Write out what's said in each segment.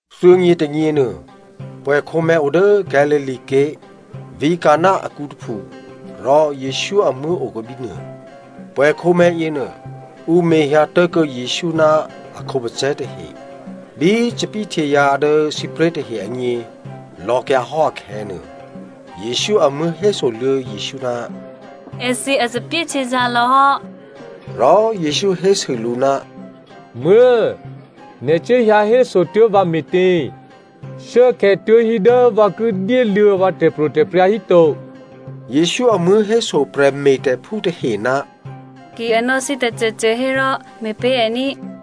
Thuô̌nyě tônyěnuô pwè̌khǒmè̤̌ odố Galilea ké̤, vǐ̤ Canan akǔ tôphu, rò Jesǔ amuố̤ okuô̌ bínuô. Pwè̌khǒmè̤̌ yěnuô, ǔ mehyǎ tố̤kuô̌ Jesǔ ná a khǒpacè̤̌ tahe. Bí thòbǐthèhtyězǎ̤ dố sǐpré̤ tahe agně lò̌kyǎhò́ akhè̌nuô, Jesǔ amuố̤ hésoluô̌ Jesǔ, “Èthǐ a thòbǐthèhtyězǎ̤ lò̌hò́.” Rò Jesǔ hésû lǔ, “Muố̤꤮, nè̤ cuốhyǎ hésotuố̤ vǎ me̤tě? Shuốkhè̌ tuố̤hí dố vǎ ki dyéluô̌ vǎ tè̤pro̤tè̤prya̤ híto.” Jesǔ amuố̤ héso prè̤me̤tè̤phú tahe, “Ki a nò̌ thǐ tôcôcô hérò me̤pé̤ è ní꤮.”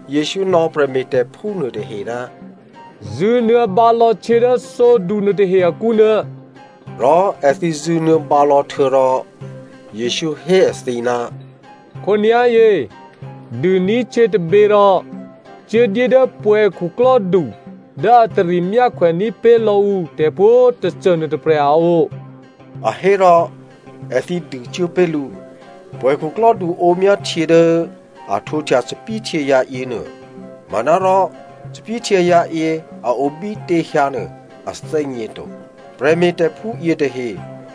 Jesǔ nò̌ prè̤me̤tè̤phú nuôtahe, “Zṳ̂nuô̌ bǎlò̌htyě dố thǒdu nuôtahe akǔnuô.” Rò èthǐ zṳ̂nuô̌ bǎlò̌ htuô̌rò, Jesǔ hé èthǐ, “Khǒnyá̤yě dûní̤htyě tôbě rò cuốdyé dố pwè̌khuklò́du dố a tari myákhwè ní̤pé̤ lò̌ ǔ tè̤pwǒ̤꤮ tôcô nuôtôprè̤ a o,” a hé. Rò èthǐ dûcuố pé̤ lǔ. Pwè̌khuklò́du ǒmyá htyě dố a htwǒhtya thòbǐthèhtyězǎ̤ yěnuô. Manárò thòbǐthèhtyězǎ̤ yě a o bítě hyǎnuô a thè́gněto. (Prè̤me̤tè̤phú yětahe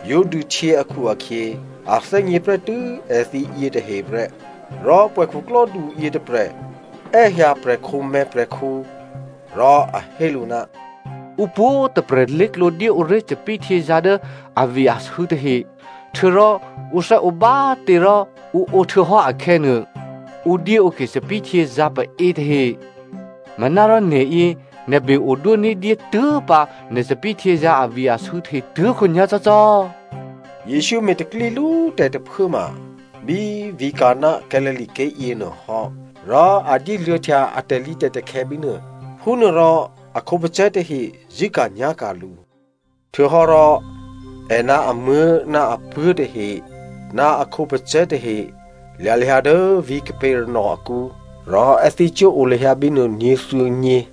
yǒ dûhtyě akhu-akhyě, a thè́gně prè́tû́ èthǐ yětahe prè́) rò pwè̌khuklò́du yětôprè̤ è́hyǎ prè̤khǒmè̤̌ prè̤khǔ, rò a hé lǔ, “Ǔ pwǒ̤꤮ tôprè̤ lé̤klǒ dyéǒré̤ thòbǐthèhtyězǎ̤ dố avi-asû̌ tahe, htuô̌rò ǔ thè́ǒ bá꤮ tě rò ǔ ǒ htuô̌hò́ akhè̌nuô, ǔ dyéǒke thòbǐthèhtyězǎ̤ paě tahe. Manárò nè̤yě nè̤ be-odwó ní̤dyé tuố̤pǎ nè̤ thòbǐthèhtyězǎ̤ avi-asû̌ tahe tuố̤khǒnyá̤ cò́cò́.” Jesǔ me̤ tè̤pro̤tè̤prya̤ lú tè̤ tôphuốma bí vǐ̤ Canan, Galilea ké̤ yěnuôhò́, rò a dyéluô̌htya a tè̤lǐtè̤takhè̌ bínuô. Phúnuôrò a khǒpacè̤̌ tahe zṳ̂́ka̤nyá̤ka̤ lǔ. Htuô̌hò́ rò è ná amuố̤ ná apuố̤ tahe ná a khǒpacè̤̌ tahe lya̤ lahyǎ dố vǐ̤ Capernaum akǔ, rò èthǐ cuố o lahyǎ bínuô nyě̤thuô̌nyě.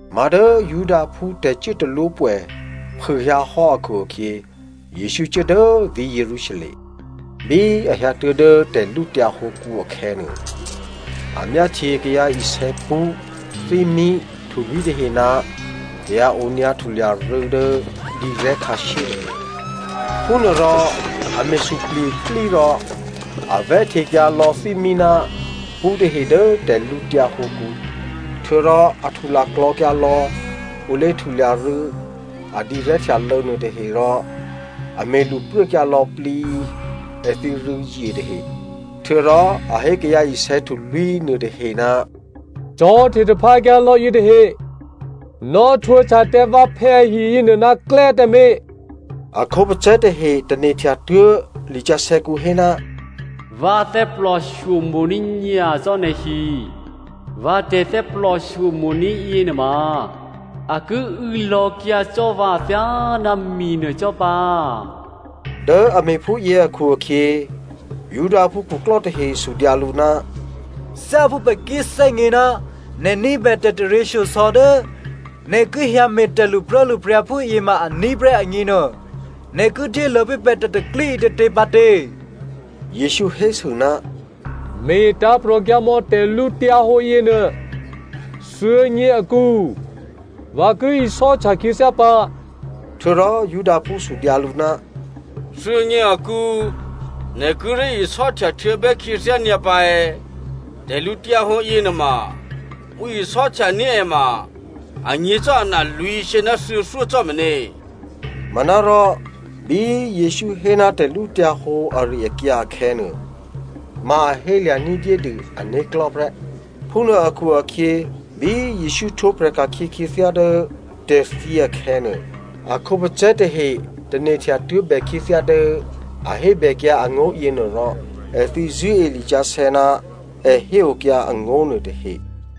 Má̤ dố Judaphú tè̤cuốtalwópwè̌ phûhyǎhò́ akhu-akhyě, Jesǔ cuố dố vǐ̤ Jerusalem. Bí a hyǎtuố̤ dố tè̤lǔtyǎ hǒkǔ akhè̌nuô, a myáhtye kayǎ isè̌ pṳ́, thímí, htulwí̤ tahe ná kayǎ onyǎ htulya rû̌ dố dǐrè̤́ khǎshyé tahe. Phúnuôrò a me̤ suplye̤ iplí rò a vè̤́htekyǎ lò̌ thímí ná pṳ́ tahe dố tè̤lǔtyǎ hǒkǔ. Htuô̌rò a htulaklò̤̌kyǎ lò̌ ǔ lé̤htulya rû̌ a dǐrè̤́htyalô̌ nuôtahe rò a me̤ lṳpruốkyǎ lò̌plǐ èthǐ rû̌zye tahe. Htuô̌rò a hé kayǎ isè̌ htulwí̤ nuôtahe, “Cò̤̌hte taphǎkyǎ lò̌ yětahe. Nò̌htwǒhtya tǎ vǎphè̌ ahi yěnuô ná klè́ tǎmé̤.” A khǒpacè̤̌ tahe tane̤htya tuố̤ lisǎsè̌kǔ hé, “Vǎ thè́plòshyo mo̤ní̤ nyacò́ nè̤hi. Vǎ tè̤thè́plòshyo mo̤ní̤ yěnuôma a ki û̌ lò̌kyǎ cò́ vǎ thyáná minuô cò́ pǎ.” Dố a me̤ phúyě akhu-akhyě, Judaphú khuklò́ tahe sudyǎ lǔ, “Thyáphú pè̤ ki thè́gně ná nè̤ ní̤bè tè̤taryěshyosò̌ dố nè̤ ki hyǎme̤ tè̤lṳpruốlṳpryǎ phúyě ma aní̤ prè́ agněnuô, nè̤ ki dyéluô̌ pé̤ pè̤ tè̤pro̤tè̤prya̤ ǐtětě pǎ tě?” Jesǔ hésû, “Me̤ tǎ̤prò̤kyǎ mò̌ tè̤lǔhǒdu yěnuô. Thuô̌nyě akǔ, vǎ ki isò́htya khyěthyá pǎ.” Htuô̌rò Judaphú sudyǎ lǔ, “Thuô̌nyě akǔ, nè̤ kíré̤ isò́htya htuô̌bè́ khyěthyá nyǎ pǎ è̌? Tè̤lǔhǒdu yěnuôma ǔ isò́htya ní̤ è ma anyě̤ cò́ ana lwǐ̤shyě ná thuô̌thyó cò́ meně꤮.” Manárò bí Jesǔ hé ná tè̤lǔhǒdu ari-akyǎ akhè̌nuô ma a hélya̤ ní̤dyédû ané̤klò̤́ prè́. Phúnuô akhu-akhyě bí Jesǔ htwǒprè̤ ka̤khyě khyěthyá dố tè̤thyě akhè̌nuô, a khǒpacè̤̌ tahe tane̤htya tuố̤bè khyěthyá dố a hébèkyǎ angó̤ yěnuô rò èthǐ zṳ̂́e lisǎsè̌ ná è héokyǎ angó̤ nuôtahe.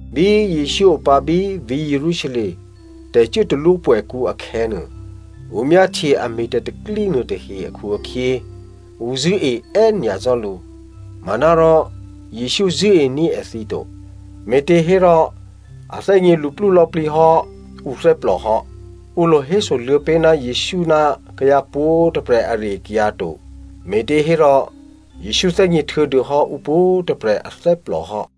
Bí Jesǔ opǎ bí vǐ̤ Jerusalem tè̤cuốtalwó pwè̌kǔ akhè̌nuô, ǔ myáhtye a me̤ tè̤pro̤tè̤prya̤ nuôtahe akhu-akhyě ǔ zṳ̂́e è́nyacò́ lǔ. Manárò Jesǔ zṳ̂́ení̤ èthǐ to, me̤těhérò a thè́gně luplú lò̌plǐ hò́ ǔthè́plò hò́. Ǔ lo hésoluô̌ pé̤ ná Jesǔ ná kayǎ pwǒ̤꤮ tôprè̤ ari-akyǎ to me̤těhérò Jesǔ thè́gně htuô̌dûhò́ ǔ pwǒ̤꤮ tôprè̤ athè́plò hò́.